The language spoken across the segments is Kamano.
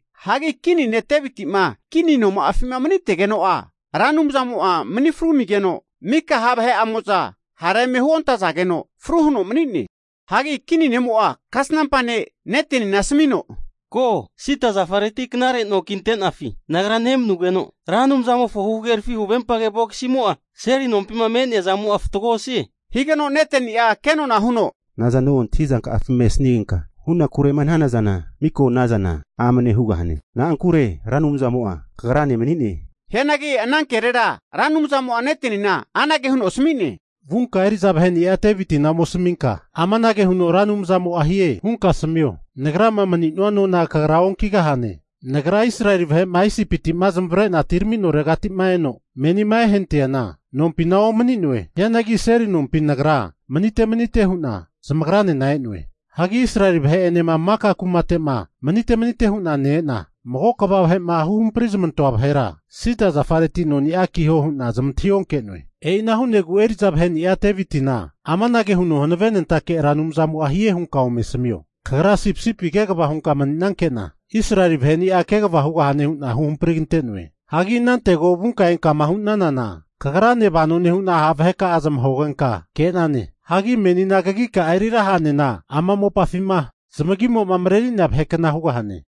Hagi kini ne' Deviti'ma kini noma'afima manitegeno'a, Ra Anumzamo'a manifru amigeno mika ha' vahe'amo'za hara eme huontazageno fru huno mani'ne. Hagi kini ne'mo'a kasnampa ne' Netenina asamino, Ko, sida zafareti knare no kintenafi nagra nemanugeno, Ra Anumzamofo huhagerafi huvempage vogisimo'a seli nompima me'nea zamo'a fatgoa osie. Higeno Neteni'a kenona huno, Nazano antahizanka'afima esanigenka hunakurema hanana zana, miko ana zana amane hugahane. Na'ankure Ra Anumzamo'a kagrane mani'ne. Hianagi ana kenagera Ra Anumzamo'a Netenina anage huno asami'ne, Vunka eri'za vahe'ni'a Devitina ome asaminka, amanage huno Ra Anumzamo'a hie hunka asamio, Nagrama maninua nona kagra onkigahane. Nagra Israeli vahe'ma Isipiti'ma zamavarena atiraminoregati'ma eno menima ehanatiana, nompina omani'noe. Hianagi seli nompi nagra manite manite hu'na zamagranena e'noe. Hagi Israeli vahe'enema maka kumate'ma manite manite'ma hu'na ne-ena, mago kva vahe'ma huhamprizamantoa vahera sida zafareti noni'a kiho hu'na zamantahi onke'noe. E'ina hu'negu eri'za vahe'ni'a Devitina amanage huno Hanavenetake Ra Anumzamo'a hie hunka ome asamio, Kagra sipisipi kegava hunka mani'nanke'na, Israeli vaheni'a kegava hugahane hu'na huhamprigante'noe. Hagi inantego vunka enkama hu'nanana kagrane vano nehu'na ha' vaheka'a zamahogenka ke'nane. Hagi menina kagika'a eriraha'nena ama mopafima zamagimo'ma mareri'nea vahe kna hugahane!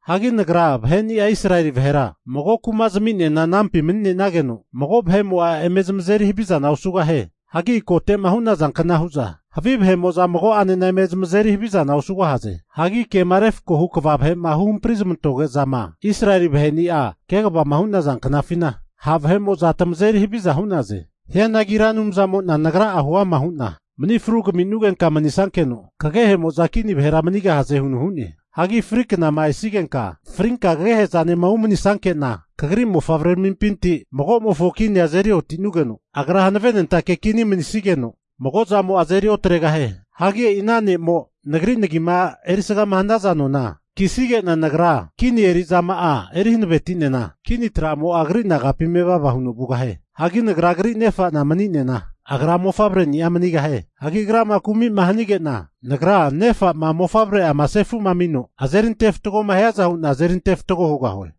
Hagi Nagra vaheni'a Israeli vahera mago kuma zaminena anampi mani'nenageno, mago vahe'mo'a eme zamazeri havizana osugahie. Hagi kote'ma hu'naza kna hu'za havi vahe'mo'za mago'anena eme zamazeri havizana osugahaze. Hagi kema refko hu kva vahe'ma huhampri zamantoge'zama Israeli vahe'ni'a kegava'ma hu'naza knafina, ha' vahe'mo'za tamazeri haviza hu'naze. Hianagi Ra Anumzamo'na Nagrani'a huama hu'na mani fru kaminugenka mani'nesankeno, kagehemo'za kini vahera manigahaze huno hu'ne. Hagi fri knakama esigenka frinka kagehezanema umanisankena, kagri mofavreramimpinti magomofo kini azeri oti'nugeno, agra hanavenentake kini mani'nesigeno, mago'zamo'a azeri otregahie. Hagi e'i ana ne'mo Nagri nagima erisgama hanaza nona kisige'na Nagra, kini eri'zama'a eri hanavetinena kini tramo'a agri nagapi mevava huno vugahie. Hagi Nagra agri nefa'na mani'nena, agra mofavreni'a manigahie. Hagi agrama kumi'ma hanige'na, Nagra nefa'ma mofavre'ama sefu'ma amino azeri antefatgoma hiaza hu'na azeri antefatgo hugahue.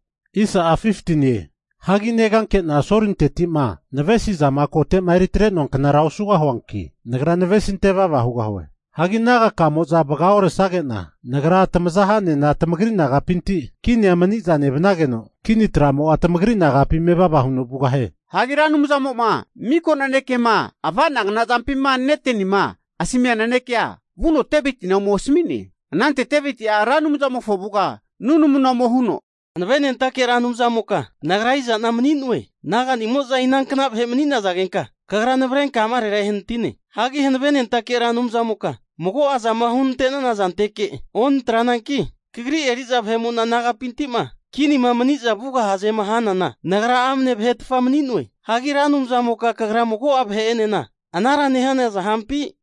Hagi negankena Solinteti'ma navesi'zama kote'ma eritre'noa knara osugahuanki, nagra navesinte vava hugahue. Hagi naga'kamo'za vagaoresage'na, Nagra tamaza ha'nena tamagri naga'pinti kinia mani'za nevanageno, kini tramo'a tamagri nagapi mevava huno vugahie. Hagi Ra Anumzamo'ma miko nanekema avanagna zampima Netenima asmia nanekea, vuno Devitina ome asami'ne. Anante Deviti'a Ra Anumzamofo avuga nunamuna ome huno, Hanavenentake Ra Anumzamoka nagra iza'na mani'noe, naga'nimo'za inankna vahe mani'nazagenka Kagra navrenka amarera ehanatine? Hagi Hanavenentake Ra Anumzamoka mago'a zama hunante'nana zanteke onatrananki, Kagri eri'za vahe'mo'na nagapinti'ma kinima mani'za vugahazema hanana nagra amne vahetfa mani'noe. Hagi Ra Anumzamoka kagra mago'a vahe'enena anara nehana zampi?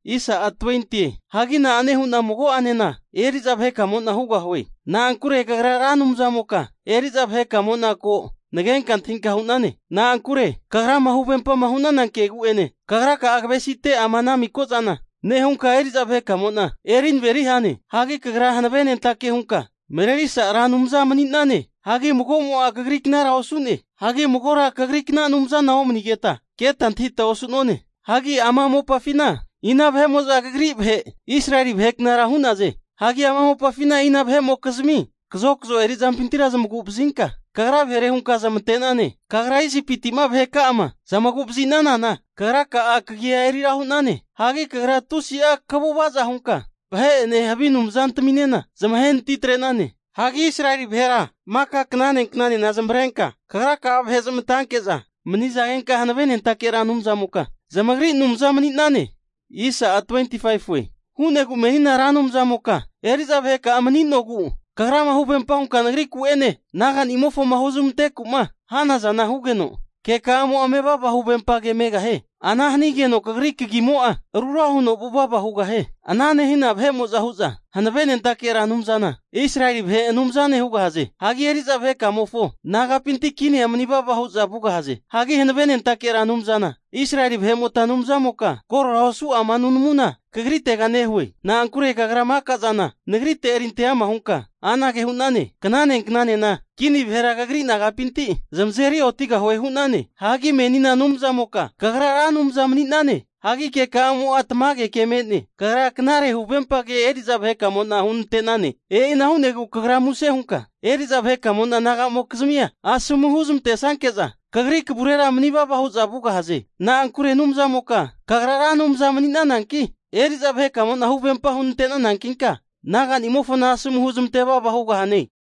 Hagi na'ane hu'na mago'anena eri'za vahekamo'na hugahie? Na'ankure kagra Ra Anumzamoka eri'za vahekamo'na ko, nagenka antahinka hu'nane. Na'ankure kagrama huvempama hu'nana kegu'ene, kagra'a kavesite ama ana miko zana nehunka eri'za vahekamo'na eri naveri hane. Hagi Kagra hanavenentake hunka marerisa Ra Anumza mani'nane. Hagi mago'mo'a kagriknara osu'ne. Hagi magora Kagrikna anumzana omanigeta keta antahita osu'none. Hagi ama mopafina ina vahe'mo'za Kagri vahe Israeli vahe knara hu'naze? Hagi ama mopafina ina vahe'mokizmi kazokazo eri'zampintira zamagu'vazinka Kagra vahere hunka zamante'nane? Kagra Isipiti'ma vaheka'ama zamagu'vazinanana Kagraka'a kagia eri ra hu'nane. Hagi Kagra tusi'a kaguvaza hunka vahe'ene havi anumzantaminena zamahe natitre'nane. Hagi Israeli vahera maka knane knanena zamavarenka Kagraka'a vahe zamantanke'za manizagenka, hanavenentake Ra Anumzamoka zamagri Anumza mani'nane. Ana hu'negu menina Ra Anumzamoka, eri'za vaheka'a mani'nogu Kagrama huvempa hunka nagriku'ene naga'nimofoma huzmanteku'ma hanazana hugeno, keka'amo'a mevava huvempa ke megahie. Ana hanigeno Kagri kagimo'a rura huno vuvava hugahie. Ana nehina hu'za Hanavenentake Ra Anumzana Israeli vahe Anumzane hugahaze. Hagi eri'za vahekamofo nagapinti kinia manivava hu'za vugahaze. Hagi Hanavenentake Ra Anumzana, Israeli vahe'mota Anumzamoka, korora osu ama nunamuna Kagritega nehue. Na'ankure Kagra maka'zana nagrite eri ante ama hunka anage hu'nane, knane knanena kini vahera kagri nagapinti zamazeri otigahue hu'nane. Hagi menina Anumzamoka, Kagra Ra Anumza mani'nane. Hagi keka'amo'a tamage ke me'ne. Kagra knare huvempa ke eri'za vaheka'amo'na hunantane. E'ina hu'negu kagra muse hunka eri'za vahekamo'na naga'mokizmia asomu huzmantesanke'za, Kagri kavurera manivava hu'za vugahaze. Na'ankure Anumzamoka, Kagra Ra Anumza mani'nananki, eri'za vahekamo'na huvempa hunantanankinka, naga'nimofona asomu huzmante vava hugahane.